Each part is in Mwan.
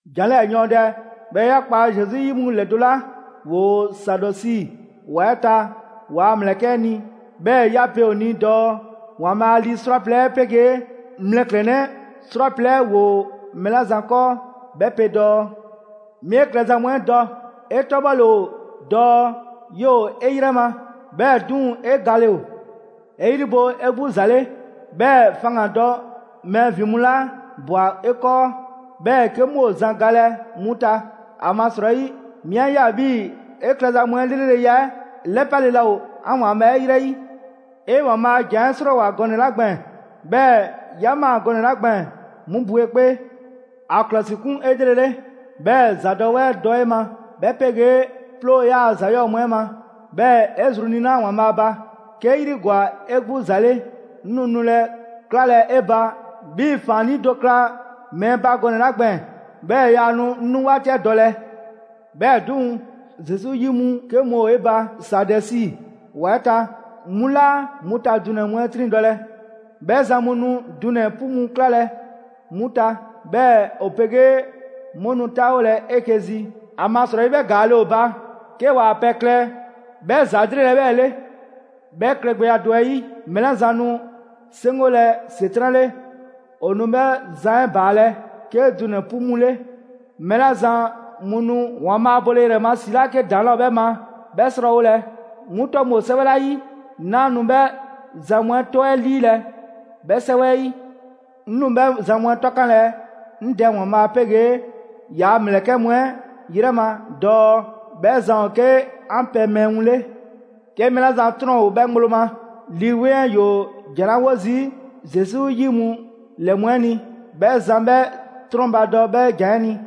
«‑Jan 'lɛɛ‑ yɔɔndɛ 'bhɛɛ‑ 'ya kpa Zesu 'yi mu ‑lɛdo' 'la ‑woo Saadɛsi ‑wa 'ɛ ta ‑waa' ‑mlɛkɛ' 'ɛ ni, 'bhɛɛ‑ 'ya pe a ni dɔɔ: ‑Waanbhaa' lii 'srwaplɛ‑ 'ɛ 'pegee mlɛklɛnnɛ 'srwaplɛ‑ 'ɛ ‑woo mɛɛ 'la zan 'kɔɔ, 'bhɛ pe dɔɔ: 'Mi 'e klɛza mu 'ɛ dɔ; 'e 'tɔbhɔle ‑o dɔɔ 'yoo‑ 'e 'yrɛ ma, 'bhɛɛ‑ 'duŋ‑ 'e gale ‑o. 'E 'yri bo 'e 'gbu ‑za 'le, 'bhɛɛ‑ faŋgandɔ mɛɛ ‑vin mu 'la ꞊bwa 'e 'kɔɔ, 'bhɛɛ‑ 'ke 'mu ‑o zan galɛ 'mu ta. ‑Amasrɔyi 'mi 'a ꞊ya 'bhii‑ 'e klɛza mu 'ɛ 'lreleya 'ɛ 'lɛpale laa ‑o 'an ‑Waanbhaa' 'ɛ ‑yrɛ 'yi. 'E ‑Waanbhaa' a ‑jan 'ɛ 'srɔɔwoa‑ gɔnɛ‑ 'la gbɛɛn‑, 'bhɛɛ‑ 'ya ꞊maa gɔnɛ‑ 'la gbɛɛn‑, 'mu bo 'e 'kpee. ‑A ‑klɔsikun 'elrele, 'bhɛɛ‑ ‑zadɔwɛɛ dɔ 'e ma, 'bhɛ 'pegee 'ploo‑ 'yaa‑ ‑za 'yɔɔ‑ mu 'ɛ ma, 'bhɛɛ‑ 'e zru niina‑ ‑Waanbhaa' ba. 'Kee 'yri ‑gwa 'e 'gbu ‑za 'le, 'ŋ nu nulɛ 'klalɛ 'e ba 'bhii‑ ‑faannii' do kla mɛɛ ba gɔnɛ‑ 'la gbɛɛn‑; 'bhɛɛ‑ 'yaa nu 'ŋ 'nu 'waati 'ɛ dɔlɛ. 'Bhɛɛ‑ 'duŋ‑, Zesu 'yi mu 'ke mu ‑o 'e ba Saadɛsi ‑wa 'ɛ ta, 'mu laa 'mu ta dunɛ‑ mu 'ɛ 'triŋdɔlɛ. 'Bhɛ zan mu nu dunɛ‑ 'pu mu 'klalɛ‑ 'mu ta, 'bhɛɛ‑ 'o 'pegee 'mu nu 'taawolɛ 'eke‑ zi; ‑amasrɔyi, 'bhɛ ‑gaale' ‑o ‑o ba 'ke ‑waa' pɛ klɛ 'bhɛ ‑za 'lrele‑ 'ɛ 'bhɛɛ‑ 'le.» «'Bhɛ klɛgbɛya do 'ɛ 'yi, mɛɛ 'la zan nu 'seŋgolɛ ‑Setran' 'le, ‑o nu 'bhɛ zan 'ɛ ‑baalɛ' 'ke dunɛ‑ 'pu mu 'le. Mɛɛ 'la zan mu nu ‑Waanbhaa' ba bole ‑yrɛ ma ‑si 'la 'ke ‑daŋ' 'laa ‑o 'bhɛ ma 'bhɛ 'srɔɔwolɛ, 'mu 'tɔ mu ‑o 'sɛwɛ 'la 'yi, 'naa nu 'bhɛ zan mu 'ɛ 'tɔ 'ɛ 'liilɛ‑ 'bhɛ 'sɛwɛ 'ɛ 'yi. 'Ŋ nu 'bhɛ zan mu 'ɛ 'tɔkanlɛ 'ŋ Dɛ ‑Waanbhaa' 'pegee ‑yaa' ‑mlɛkɛ' mu 'ɛ 'yrɛ ma dɔɔ 'bhɛ zan ‑o 'ke 'an pɛ mɛɛ mu 'le. 'Ke mɛɛ 'la zan 'trɔn ‑o 'bhɛ ŋgblo ma, Lii 'Weŋ 'ɛ ‑yoo ‑jan 'la 'wo zii' Zesu 'yi mu ‑lɛ mu 'ɛ ni, 'bhɛ zan 'bhɛ 'trɔnbadɔ 'bhɛ ‑jan 'ɛ ni!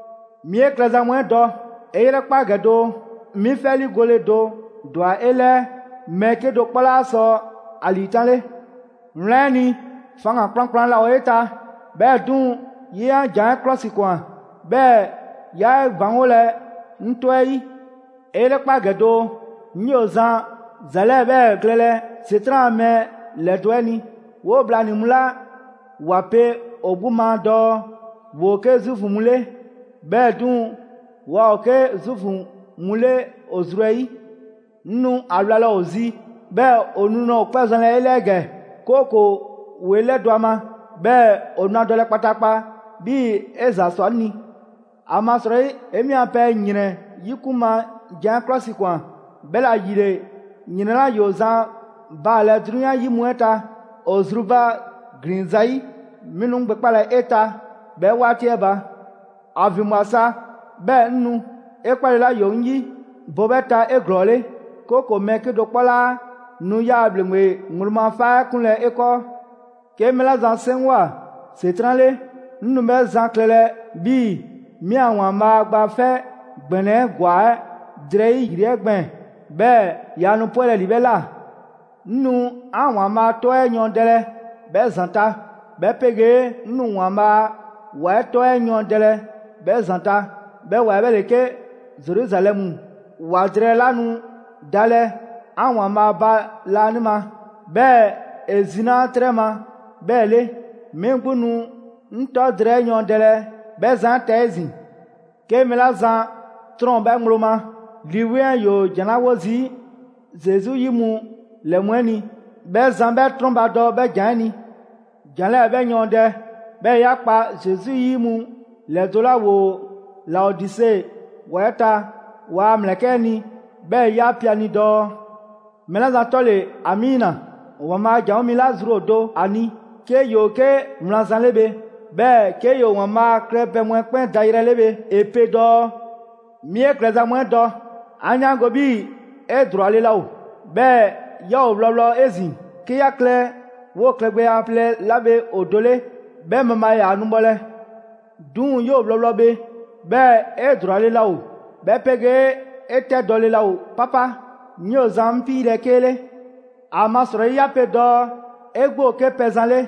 'Mi 'e klɛza mu 'ɛ dɔ. 'E 'yrɛkpa ‑gɛ doo: 'Mi 'fɛ 'liigole do ‑dwa 'e 'lɛɛ, mɛɛ 'kedo‑ 'kpɔ 'laa sɔ ‑a ‑liitanle. Wlan 'ɛ ni, faŋgan‑ kplankplan 'laa ‑o 'e ta, 'bhɛɛ‑ 'duŋ‑, 'ye 'an ‑jan 'ɛ 'klɔsikwan; 'bhɛɛ‑ 'yaa 'e ‑baŋgolɛ 'ŋ 'tɔ 'ɛ 'yi. 'E 'yrɛkpa ‑gɛ doo: 'ŋ 'yoo‑ zan ‑za 'lɛɛ‑ 'bhɛɛ‑ klɛlɛ ‑Setran' ‑a mɛɛ ‑lɛdo' 'ɛ ni; 'woo bhlanii‑ mu 'la ‑wa pe ‑o 'gbu ma dɔɔ ‑woo 'ke Zuufu mu 'le, 'bhɛɛ‑ 'duŋ‑, waa ‑o 'ke Zuufu mu 'le ‑o zru 'ɛ 'yi. 'Ŋ nu ‑a wlalɛ ‑o zi 'bhɛɛ‑ ‑o nu nulɛ ‑o 'kpɔ zɛnlɛ 'e 'lɛɛ ‑gɛ, 'kooko‑ ‑woo 'e 'lɛdɔ‑ ‑a ma. 'Bhɛɛ‑ ‑o nu ‑a dɔlɛ kpataakpa 'bhii‑ 'e ‑za ꞊swa 'ŋ ni. ‑Amasrɔyi 'e 'mi a pɛ ‑yrɛn 'yikun ma jan 'ɛ 'klɔsikwan, 'bhɛla‑ ‑yile ‑yrɛn 'la ‑yoo zan baalɛ 'drunyan 'yi mu 'ɛ ta ‑o zrubaglin zayi', 'mi nu 'ŋ gbɛkpalɛ 'e ta 'bhɛ 'waati 'ɛ ba. ‑A ‑vinbwa sa 'bhɛɛ‑ 'ŋ nu! 'E 'kpale 'la ‑yoo 'ŋ 'yi, bo 'bhɛ ta 'eglɔɔle; 'kooko‑ mɛɛ 'kedo‑ 'kpɔ 'laa nu 'yaa‑ ‑bhleŋgbe ŋgblo ma 'faa 'ɛ 'kunlɛ‑ 'e 'kɔɔ. 'Ke mɛɛ 'la zan 'seŋgwa‑ ‑Setran' 'le, 'ŋ nu 'bhɛ zan klɛlɛ 'bhii‑ 'mi a ‑Waanbhaa' Gba 'Fɛ ‑Gbɛnɛ 'ɛ ‑gwa 'ɛ drɛyi' ‑yri 'ɛ gbɛɛn‑, 'bhɛɛ‑ yaa nu 'pwɛlɛ‑ ‑li 'bhɛ ꞊la. 'Ŋ nu 'an ‑Waanbhaa' 'tɔ 'ɛ yɔɔndɛlɛ 'bhɛ zan ta, 'bhɛ 'pegee 'ŋ nu ‑Waanbhaa' a ‑wa 'ɛ 'tɔ 'ɛ yɔɔndɛlɛ 'bhɛ zan ta. 'Bhɛ ‑wa 'ɛ 'bhɛ ‑le 'ke Zeruzalɛmu ‑wa drɛɛ 'la nu dalɛ 'an ‑Waanbhaa' ba laanima, 'bhɛɛ‑ ‑e zinaa' 'trɛ ma 'bhɛɛ‑ 'le. 'Mi 'gbu nu 'ŋ 'tɔ drɛɛ 'ɛ yɔɔndɛlɛ 'bhɛ zan 'ɛ ta 'ezin‑. 'Ke mɛɛ 'la zan 'trɔn ‑o 'bhɛ ŋgblo ma, Lii 'Weŋ 'ɛ ‑yoo ‑jan 'la 'wo zii' Zesu 'yi mu ‑lɛ mu 'ɛ ni, 'bhɛ zan 'bhɛ 'trɔnbadɔ 'bhɛ ‑jan 'ɛ ni! «‑Jan 'lɛɛ‑ 'bhɛ yɔɔndɛ, 'bhɛɛ‑ 'ya kpa Zesu 'yi mu ‑lɛdo' 'la ‑woo Laodise ‑wa 'ɛ ta ‑waa' ‑mlɛkɛ' 'ɛ ni, 'bhɛɛ‑ 'ya pe a ni dɔɔ: Mɛɛ 'la zan 'tɔ ‑le ‑Amiina, ‑Waanbhaa' a ‑janwo' mi 'la zru ‑o do ‑a ni, 'ke ‑yoo 'ke wlan zan 'le bhe; 'bhɛɛ‑ 'ke ‑yoo ‑Waanbhaa' klɛpɛ mu 'ɛ 'kpɛn dayrɛ 'le bhe; ‑e pe dɔɔ: 'Mi 'e klɛza mu 'ɛ dɔ; 'an 'yaango‑ 'bhii‑ 'e ‑drwale' laa ‑o, 'bhɛɛ‑ 'yaa ‑o wlɔwlɔ 'ezin‑. 'Kee 'yaa‑ klɛ 'woo‑ klɛgbɛya plɛ 'la bhe ‑o do 'le, 'bhɛ mabhaa ‑yaa' nu bhɔlɛ. 'Duŋ‑, 'yoo‑ wlɔwlɔ bhe, 'bhɛɛ‑ 'e ‑drwale' laa ‑o, 'bhɛ 'pegee‑ 'e 'tɛdɔle laa ‑o 'papa, 'ŋ 'yoo zan 'ŋ 'piilɛ‑ 'kee 'le. ‑Amasrɔyi 'ya pe dɔɔ 'e 'gbu ‑o 'ke pɛzan 'le,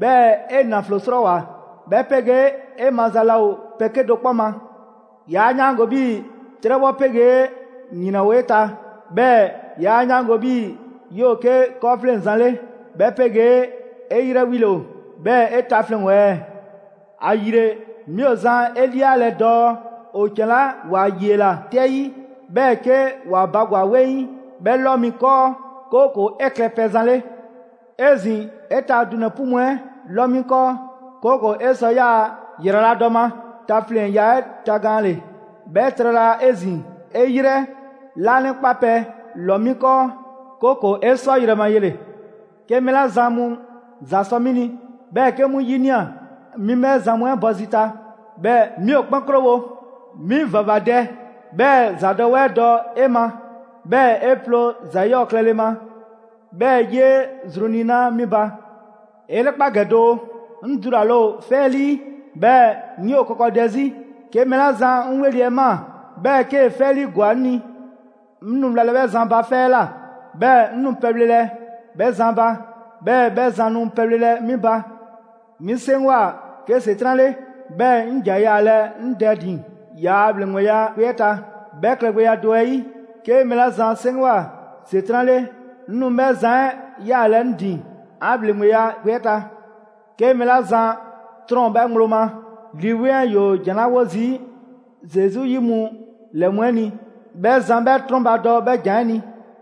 'bhɛɛ‑ 'e ‑naflo 'srɔɔwoa‑, 'bhɛ 'pegee 'e maza laa ‑o pɛ 'kedo‑ 'kpɔ ma. 'Yaa 'yaango‑ 'bhii‑ 'trɛbhɔ 'pegee ‑yrɛn ‑o 'e ta. 'Bhɛɛ‑ 'yaa 'yaango‑ 'bhii‑ 'yoo‑ 'ke 'kɔɔfleŋzan 'le, 'bhɛ 'pegee 'e 'yrɛ 'wile‑ ‑o, 'bhɛɛ‑ 'e tafleŋ‑ ‑o ɛɛ? ‑Ayile, 'mi ‑o zan 'e 'lialɛ‑ dɔɔ ‑o ‑can 'la ‑wa 'yiela‑ 'tɛ 'yi, 'bhɛɛ‑ 'ke ‑wa bagwa‑ 'weŋ, 'bhɛ 'lɔ 'mi 'kɔɔ, 'kooko‑ 'e klɛ pɛzan 'le. 'Ezin‑, 'e ta dunɛ‑ 'pu mu 'ɛ 'lɔ 'mi 'kɔɔ, 'kooko‑ 'e sɔ 'yaa‑ ‑yraladɔ ma tafleŋya 'ɛ tagaanle. 'Bhɛ trala 'ezin‑, 'e 'yrɛ 'laanɛkpapɛ ‑lɔ 'mi 'kɔɔ, 'kooko‑ 'e sɔ yrɛ ma yele‑. 'Ke mɛɛ 'la zan mu ‑za sɔ 'mi ni, 'bhɛɛ‑ 'ke 'mu 'yinia‑, 'mi 'bhɛ zan mu 'ɛ bɔ zi ta, 'bhɛɛ‑ 'mi ‑o 'kpɛn 'krowo‑. 'Mi ‑vavadɛ, 'bhɛɛ‑ ‑zadɔwɛɛ dɔ 'e ma, 'bhɛɛ‑ 'e ploo ‑za 'yɔɔ‑ klɛle ma, 'bhɛɛ‑ 'yee zru niina‑ 'mi ba. 'E 'yrɛkpa ‑gɛ doo: 'Ŋ dulale ‑o 'fɛ 'ɛ 'lii, 'bhɛɛ‑ 'ŋ 'yoo‑ kɔkɔdɛ 'zi; 'ke mɛɛ 'la zan 'ŋ 'weli‑ 'ɛ ꞊maa, 'bhɛɛ‑ 'kee‑ 'fɛ 'ɛ 'liigwa‑ 'ŋ ni. 'Ŋ nu wlalɛ 'bhɛ zan ba 'fɛ 'ɛ ꞊la, 'bhɛɛ‑ 'ŋ nu pɛbhlelɛ 'bhɛ zan ba, 'bhɛɛ‑ 'bhɛ zan nu pɛbhlelɛ 'mi ba. 'Mi 'seŋgwa‑ 'ke ‑Setran' 'le, 'bhɛɛ‑ 'ŋ ‑ja yaalɛ 'ŋ Dɛ ‑din ‑yaa' ‑bhleŋgbe 'yaakpe‑ 'ɛ ta. 'Bhɛ klɛgbɛya do 'ɛ 'yi, 'ke mɛɛ 'la zan 'seŋgwa‑ ‑Setran' 'le, 'ŋ nu 'bhɛ zan 'ɛ yaalɛ 'ŋ ‑din 'an ‑bhleŋgbe 'yaakpe‑ 'ɛ ta. 'Ke mɛɛ 'la zan 'trɔn ‑o 'bhɛ ŋgblo ma, Lii 'Weŋ 'ɛ ‑yoo ‑jan 'la 'wo zii' Zesu 'yi mu ‑lɛ mu 'ɛ ni, 'bhɛ zan 'bhɛ 'trɔnbadɔ 'bhɛ ‑jan 'ɛ ni!»